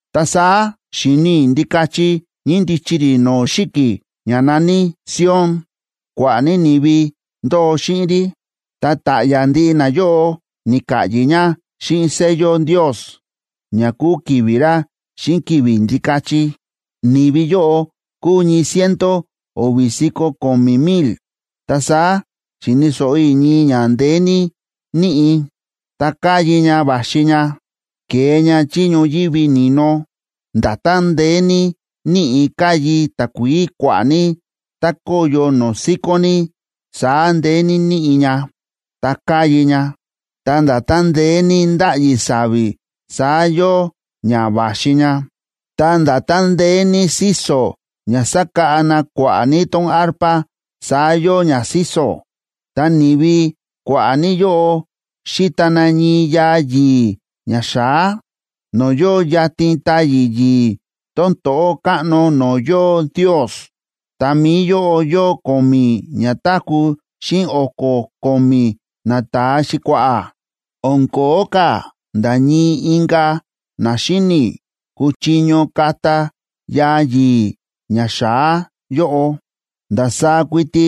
Ta saá xi̱ni i̱ Ndikachi ñíndichi rí no̱o̱ xi̱ki̱ ña na̱ní Sion. Kua̱ꞌa̱ ní ni̱vi ndóo xíꞌin rí, ta ta̱ꞌya̱ ndiꞌi nayóꞌo ni̱ka̱ꞌyi̱ ña xíꞌin sello Ndios, ña kúu ki̱vi̱ ra xíꞌin ki̱vi̱ Ndikachi. Ni̱vi yóꞌo kúu ñii ciento o̱vi̱ si̱ko̱ ko̱mi̱ mil. Ta saá xi̱ni̱ so̱ꞌo i̱ ñii ña ndeé ní níꞌi̱, ta káyi ña va̱xi ña, kée ña chí ñoyívi ni̱no. Nda̱tán ndeé ní níꞌi̱ káyi takuií kua̱ꞌa̱ ní, tá kóyo no̱o̱ síkón ní, saá ndeé ní níꞌi̱ ña, ta káyi ña. Ta nda̱tán ndeé ní ndáꞌyi sa̱vi̱, saá yóo ña va̱xi ña. Ta nda̱tán ndeé ní síso̱ ña sákáꞌa na kua̱ꞌa̱ ní tón arpa, saá yóo ña síso̱. Nani̱vi kua̱ꞌa̱ ní yóꞌo xíta na ñii yaa yi̱i̱ ña xa̱á, no̱o̱ yóo yatin táyi̱ yi̱i̱ tón to̱ꞌó káꞌno no̱o̱ yóo Ndios. Ta mi̱i yóꞌo yóo ko̱mi̱ ñatáku̱ xíꞌin o̱ko̱ ko̱mi̱ nata̱a xi̱kua̱ꞌa̱. O̱n ko̱ó ka̱ nda̱ ñii inka̱ na xíni̱ kuchiño kata yaa yi̱i̱ ña xa̱á yóꞌo. Ndasaá kuiti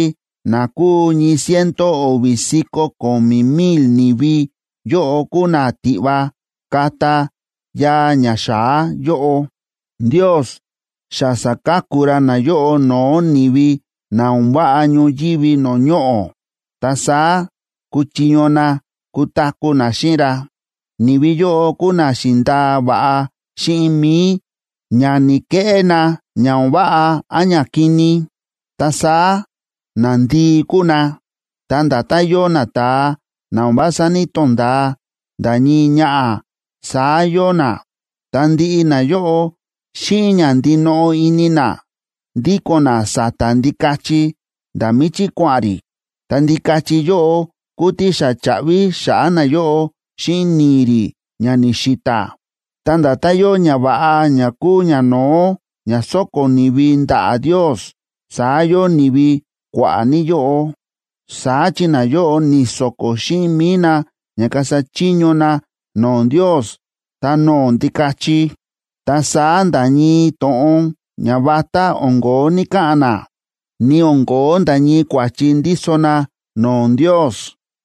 na kúu ñii ciento o̱vi̱ si̱ko̱ ko̱mi̱ mil ni̱vi yóꞌo kúu na tiꞌva kata yaa ña xa̱á yóꞌo. Ndios xa sa̱ka̱ku ra nayóꞌo no̱o̱ ni̱vi na o̱n váꞌa ñoyívi no̱o̱ ñoꞌo̱, ta saá kúchiño na kutaku̱ na xíꞌin ra. Ni̱vi yóꞌo kúu na xi̱ndaa va̱ꞌa xíꞌin mi̱i ña ni̱‑keꞌé na ña o̱n váꞌa án ñakini. Ta saá nandii kúu na, ta nda̱tán yóo nata̱a na o̱n vása ní‑tonda̱a nda̱ ñii ñaꞌa̱, saá yóo na. Ta ndiꞌi nayóꞌo, xíꞌin ña ndinoꞌo ini na, ndíko̱n na sa̱ta̱ Ndikachi nda̱ míchí kua̱ꞌa̱n rí. Ta Ndikachi yóꞌo kúu tí xa cha̱ꞌvi xa̱ꞌa̱ nayóꞌo xíꞌin ni̱i̱ rí ña ni̱xi̱ta̱. Ta nda̱tán yóo ñava̱ꞌa ña kúu ñano̱ó ña sóko̱ ni̱vi ndaꞌa̱ Ndios, saá yóo ni̱vi kua̱ꞌa̱ ní yóꞌo. Saá chi nayóꞌo ni̱so̱ko̱ xíꞌin mi̱i na ña kasa chiño na no̱o̱ Ndios ta no̱o̱ Ndikachi. Ta saá nda̱ ñii to̱ꞌon ñavatá o̱n ko̱ó ni̱ka̱ꞌa̱n na, ni o̱n ko̱ó nda̱ ñii kua̱chi ndíso na no̱o̱ Ndios.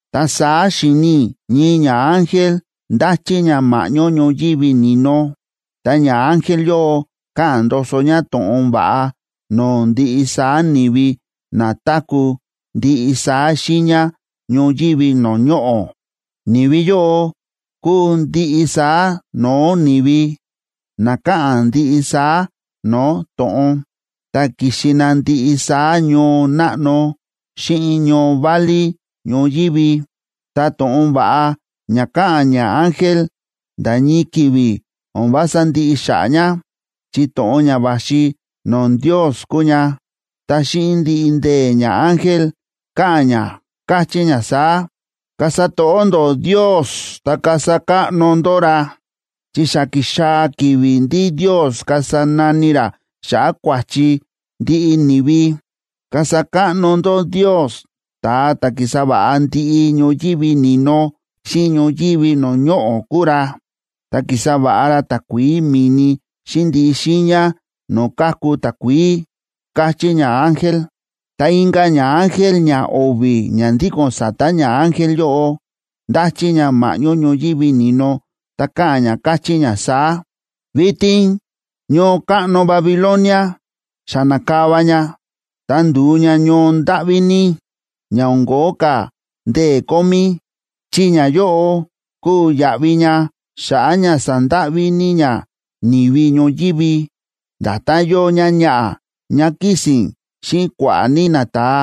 Ta saá xi̱ni i̱ ñii ñaángel ndáchí ña ma̱ꞌñó ñoyívi ni̱no, ta ñaángel yóꞌo káꞌa̱n ndoso ña to̱ꞌon va̱ꞌa no̱o̱ ndiꞌi saá ni̱vi na táku̱ ndiꞌi saá xiiña ñoyívi no̱o̱ ñoꞌo̱. Ni̱vi yóꞌo kúu ndiꞌi saá no̱o̱ ni̱vi, na káꞌa̱n ndiꞌi saá no̱o̱ to̱ꞌon, ta ki̱xi na ndiꞌi saá ñoo náꞌno xíꞌin ñoo válí ñoyívi. Ta to̱ꞌon va̱ꞌa ña káꞌa̱n ñaángel nda̱ ñii ki̱vi̱ o̱n vása ndiꞌi xa̱ꞌa̱ ña, chi to̱ꞌon ña va̱xi no̱o̱ Ndios kúu ña. Ta xíꞌin ndiꞌi ndee̱, ñaángel káꞌa̱n ña, káchí ña saá: ―Kasa to̱ꞌó ndó Ndios ta kasa káꞌno ndó ra, chi xa ki̱xaa̱ ki̱vi̱ ndí Ndios kasa nani ra xa̱ꞌa̱ kua̱chi ndiꞌi ni̱vi. Kasa káꞌno ndó Ndios, ta̱a ta̱ ki̱sa va̱ꞌa ndiꞌi ñoyívi ni̱no xíꞌin ñoyívi no̱o̱ ñoꞌo̱ kúu ra, ta ki̱sa va̱ꞌa ra takuií mi̱ni xíꞌin ndiꞌi xiiña no̱o̱ káku takuií ―káchí ñaángel. Ta inka̱ ñaángel ñao̱vi̱ ña ndíko̱n sa̱ta̱ ñaángel yóꞌo, ndáchí ña ma̱ꞌñó ñoyívi ni̱no, ta káꞌa̱n ña káchí ña saá: ―Vitin ñoo káꞌno Babilonia xa na̱kava ña, ta ndu̱u ña ñoo ndáꞌví ní, ña o̱n ko̱ó ka̱ ndee̱ kómí, chi ñayóꞌo kúu yaꞌvi ña xa̱ꞌa̱ ña sa̱ndáꞌví ní ña ni̱vi ñoyívi. Nda̱tán yóo ñáñaꞌa̱ ñá kísi̱n xíꞌin kua̱ꞌa̱ ní nata̱a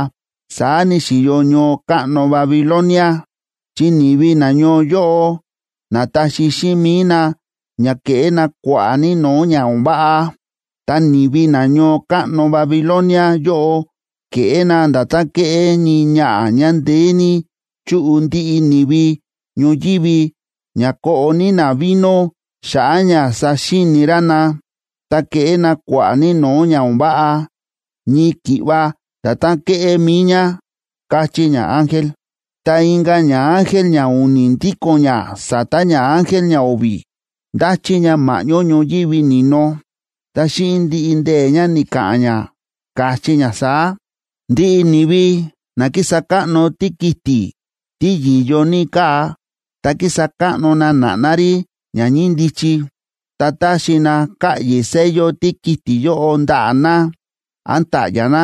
saá ni̱xi̱yo ñoo káꞌno Babilonia, chi ni̱vi nañoo yóꞌo na̱taxi xíꞌin mi̱i na ña keꞌé na kua̱ꞌa̱ ní no̱o̱ ña o̱n váꞌa. Ta ni̱vi na ñoo káꞌno Babilonia yóꞌo kéꞌé na nda̱tán kéꞌé ñii ñaꞌa̱ ñá ndeé ní chu̱ꞌu ndiꞌi ni̱vi ñoyívi ña koꞌo ní na vino xa̱ꞌa̱ ña saxíini rá na, ta keꞌé na kua̱ꞌa̱ ní no̱o̱ ña o̱n váꞌa, ñii ki̱ꞌva nda̱tán ke̱ꞌé mi̱i ñá ―káchí ñaángel. Ta inka̱ ñaángel ñau̱ni̱ ndíko̱n ña sa̱ta̱ ñaángel ñao̱vi̱, ndáchí ña ma̱ꞌñó ñoyívi ni̱no, ta xíꞌin ndiꞌi ndee̱ ña, ni̱ka̱ꞌa̱n ña, káchí ña saá: ―Ndiꞌi ni̱vi na kísa káꞌno tíkiti̱ tí yi̱yo ní káa, ta kísa káꞌno na na̱ꞌná rí ña ñíndichi, ta táxi na ka̱ꞌyi̱ sello tíkiti̱ yóꞌo ndaꞌa̱ na án ta̱ꞌya̱ na,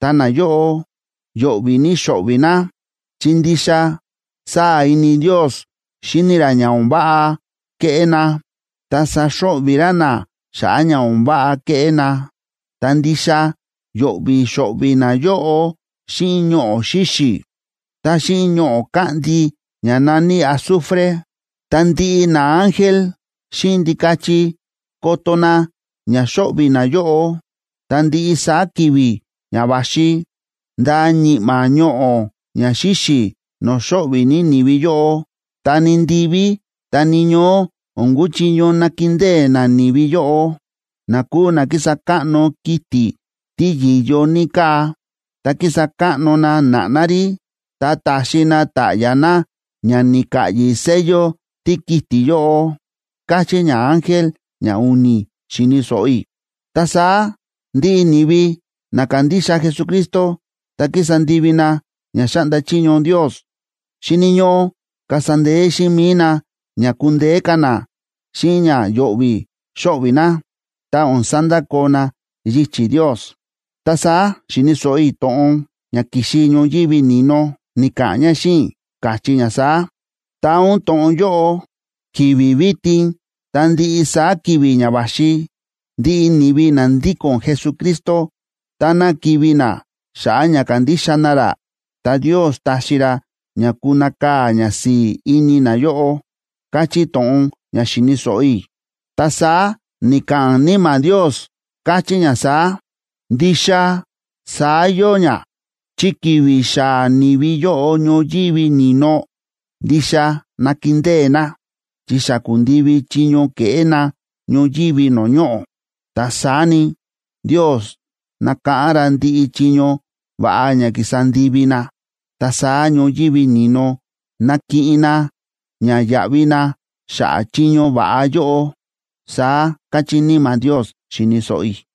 ta nayóꞌo yo̱ꞌvi̱ ní xo̱ꞌvi̱ na, chi ndixa sáa̱ ini Ndios xíni ra ña o̱n váꞌa kéꞌé na, ta saxo̱ꞌvi̱ ra na xa̱ꞌa̱ ña o̱n váꞌa kéꞌé na.a Ta ndixa yo̱ꞌvi̱ xo̱ꞌvi̱ nayóꞌo xíꞌin ñoꞌo̱ xíxi̱, ta xíꞌin ñoꞌo̱ káꞌndi ña na̱ní azufre. Ta ndiꞌi naángel xíꞌin Ndikachi koto na ña xo̱ꞌvi̱ nayóꞌo. Ta ndiꞌi saá ki̱vi̱ ña va̱xi, ndaa ñi̱ꞌma̱ ñoꞌo̱ ña xíxi̱ no̱o̱ xo̱ꞌvi̱ ní ni̱vi yóꞌo. Ta ni ndiví, ta ni ñoó o̱n kuchiño nakindée nani̱vi yóꞌo, na kúu na ki̱sa káꞌno kiti̱ tí yi̱yo ní káa, ta ki̱sa káꞌno na na̱ꞌná rí, ta ta̱xi na ta̱ꞌya̱ na ña ni̱ka̱ꞌyi̱ sello tíkiti̱ yóꞌo ―káchí ñaángel ñau̱ni̱, xi̱ni̱ so̱ꞌo i̱. Ta saá ndiꞌi ni̱vi na kándixa Jesucristo ta kísa ndivi na ña xáꞌnda chiño Ndios, xíni̱ ñóꞌó kasa ndee̱ xíꞌin mi̱i na ña kundeé ka̱ na xíꞌin ña yo̱ꞌvi̱ xo̱ꞌvi̱ na, ta o̱n sandakoo na yichi̱ Ndios. Ta saá xi̱ni̱ so̱ꞌo i̱ to̱ꞌon ña ki̱xi ñoyívi ni̱no, ni̱ka̱ꞌa̱n ña xíꞌin i̱, káchí ña saá: ―Taa ún to̱ꞌon yóꞌo: “Ki̱vi̱ vitin ta ndiꞌi saá ki̱vi̱ ña va̱xi, ndiꞌi ni̱vi na ndíko̱n Jesucristo, táná kivi̱ na xa̱ꞌa̱ ña kándixa na ra, ta Ndios taxi ra ña kunakaa̱ ñasi̱i̱ ini nayóꞌo” ―káchí to̱ꞌon ña xi̱ni̱ so̱ꞌo i̱. Ta saá ni̱ka̱ꞌa̱n Níma̱ Ndios, káchí ña saá: ―Ndixa saá yóo ña, chi ki̱vi̱ xaa̱ ni̱vi yóꞌo ñoyívi ni̱no, ndixa nakindée na, chi xa ku̱ndivi chiño ke̱ꞌé na ñoyívi no̱o̱ ñoꞌo̱. Ta saá ni, Ndios nákáꞌán ra ndiꞌi chiño va̱ꞌa ña ki̱sa ndivi na, ta saá ñoyívi ni̱no nakiꞌin na ña yaꞌvi na xa̱ꞌa̱ chiño va̱ꞌa yóꞌo ―saá káchí Níma̱ Ndios, xi̱ni̱ so̱ꞌo i̱.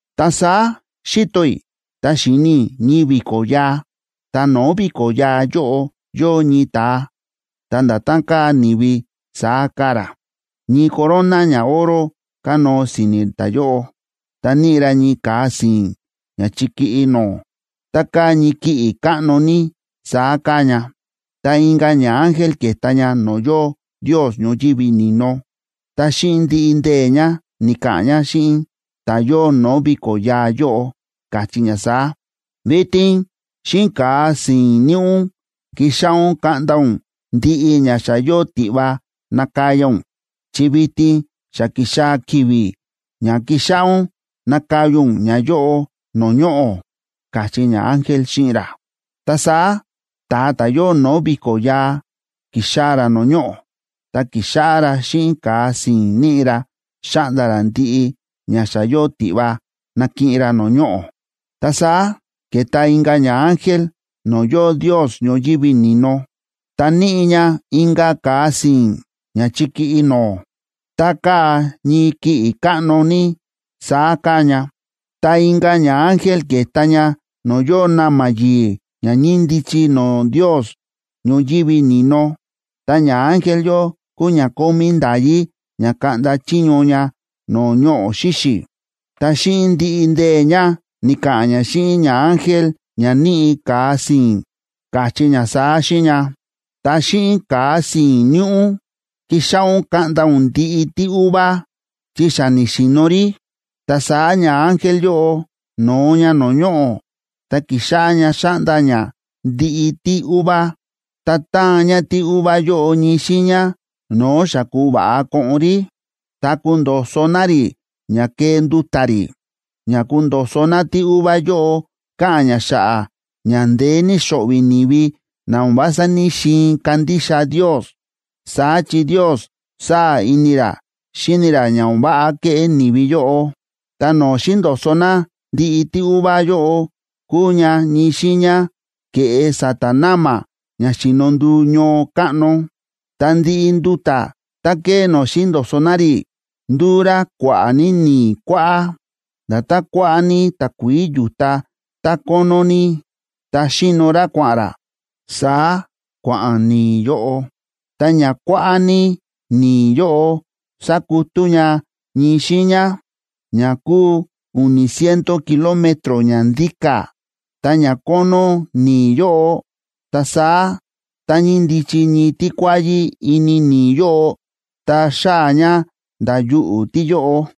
Ta saá xi̱to i̱, ta xi̱ni i̱ ñii vi̱ko̱ yaa, ta no̱o̱ vi̱ko̱ yaa yóꞌo, yóo ñii ta̱a ta̱ nda̱tán káa ni̱vi saá káa ra. Ñii corona ñaoro kánóo si̱ni̱ ta̱yóꞌo, ta níꞌi ra ñii ka̱a si̱i̱n ña chikíꞌí no̱o̱. Tá káa ñii kiꞌi̱ káꞌno ní, saá káa ña. Ta inka̱ ñaángel ke̱ta ña no̱o̱ yóo Ndios ñoyívi ni̱no. Ta xíꞌin ndiꞌi ndee̱ ña, ni̱ka̱ꞌa̱n ña xíꞌin ta̱ yóo no̱o̱ vi̱ko̱ yaa yóꞌo, káchí ña saá: ―Vitin xíꞌin ka̱a si̱i̱n níꞌi ún, kixáꞌá ún kaꞌnda ún ndiꞌi ña xa yóo tiꞌva nakaya ún, chi vitin xa ki̱xaa̱ ki̱vi̱ ña kixáꞌá ún nakaya ún ñayóꞌo no̱o̱ ñoꞌo̱ ―káchí ñaángel xíꞌin ra. Ta saá ta̱a ta̱ yóo no̱o̱ vi̱ko̱ yaa, ki̱xaa̱ ra no̱o̱ ñoꞌo̱, ta ki̱xáꞌá ra xíꞌin ka̱a si̱i̱n níꞌi ra, xáꞌnda ra ndiꞌi ña xa yóo tiꞌva nakiꞌin ra no̱o̱ ñoꞌo̱. Ta saá ke̱ta inka̱ ñaángel no̱o̱ yóo Ndios ñoyívi ni̱no, ta níꞌi ña inka̱ ka̱a si̱i̱n, ña chikíꞌí no̱o̱. Tá káa ñii kiꞌi̱ káꞌno ní, saá káa ña. Ta inka̱ ñaángel ke̱ta ña no̱o̱ yóo na̱ma̱ yi̱i̱ ña ñíndichi no̱o̱ Ndios ñoyívi ni̱no. Ta ñaángel yóꞌo kúu ña kómí nda̱yí ña kaꞌnda chiño ña no̱o̱ ñoꞌo̱ xíxi̱. Ta xíꞌin ndiꞌi ndee̱ ña, ni̱ka̱ꞌa̱n ña xíꞌin ñaángel ña níꞌi ka̱a si̱i̱n, káchí ña saá xíꞌin ña: ―Ta xíꞌin ka̱a si̱i̱n níꞌi ún, kixáꞌá ún kaꞌnda ún ndiꞌi tíuva, chi xa ni̱xi̱no̱ rí. Ta saá ñaángel yóꞌo no̱o ña no̱o̱ ñoꞌo̱, ta ki̱xáꞌá ña xáꞌnda ña ndiꞌi tíuva. Ta ta̱an ña tíuva yóꞌo ñii xiiña no̱o̱ xa ku̱va̱ꞌa koꞌon rí, ta kundo̱so̱ na rí ña kee nduta̱ rí. Ña kundo̱so̱ na tíuva yóꞌo káꞌa̱n ña xa̱ꞌa̱ ña ndeé ní xo̱ꞌvi̱ ni̱vi na o̱n vása ní‑xiin kandixa Ndios. Saá chi Ndios sáa̱ ini ra xíni ra ña o̱n váꞌa kéꞌé ni̱vi yóꞌo. Ta no̱o̱ xi̱ndo̱so̱ na ndiꞌi tíuva yóꞌo kúu ña ñii xiiña ke̱ꞌe sa̱ta̱ na̱ma̱ ña xíno nduu ñoo káꞌno. Ta ndiꞌi nduta̱ tá ke̱e no̱o̱ xi̱ndo̱so̱ na rí, ndu̱u rá kua̱ꞌa̱ ní ni̱i̱ kuáꞌá. Nda̱tán kua̱ꞌa̱ ní takuií yu̱ta tá kónó ní ta xíno rá kua̱ꞌa̱n rá, saá kua̱ꞌa̱n ni̱i̱ yóꞌo. Ta ña kua̱ꞌa̱ ní ni̱i̱ yóꞌo sa̱kutú ña ñii xiiña, ña kúu u̱ni̱ ciento kilómetro ña ndíka̱,b ta ña kónó ni̱i̱ yóꞌo. Ta saá tá ñíndichi ñii tíkuáyí ini ni̱i̱ yóꞌo, ta xáa̱ ña nda̱ yuꞌu̱ tíyóꞌo.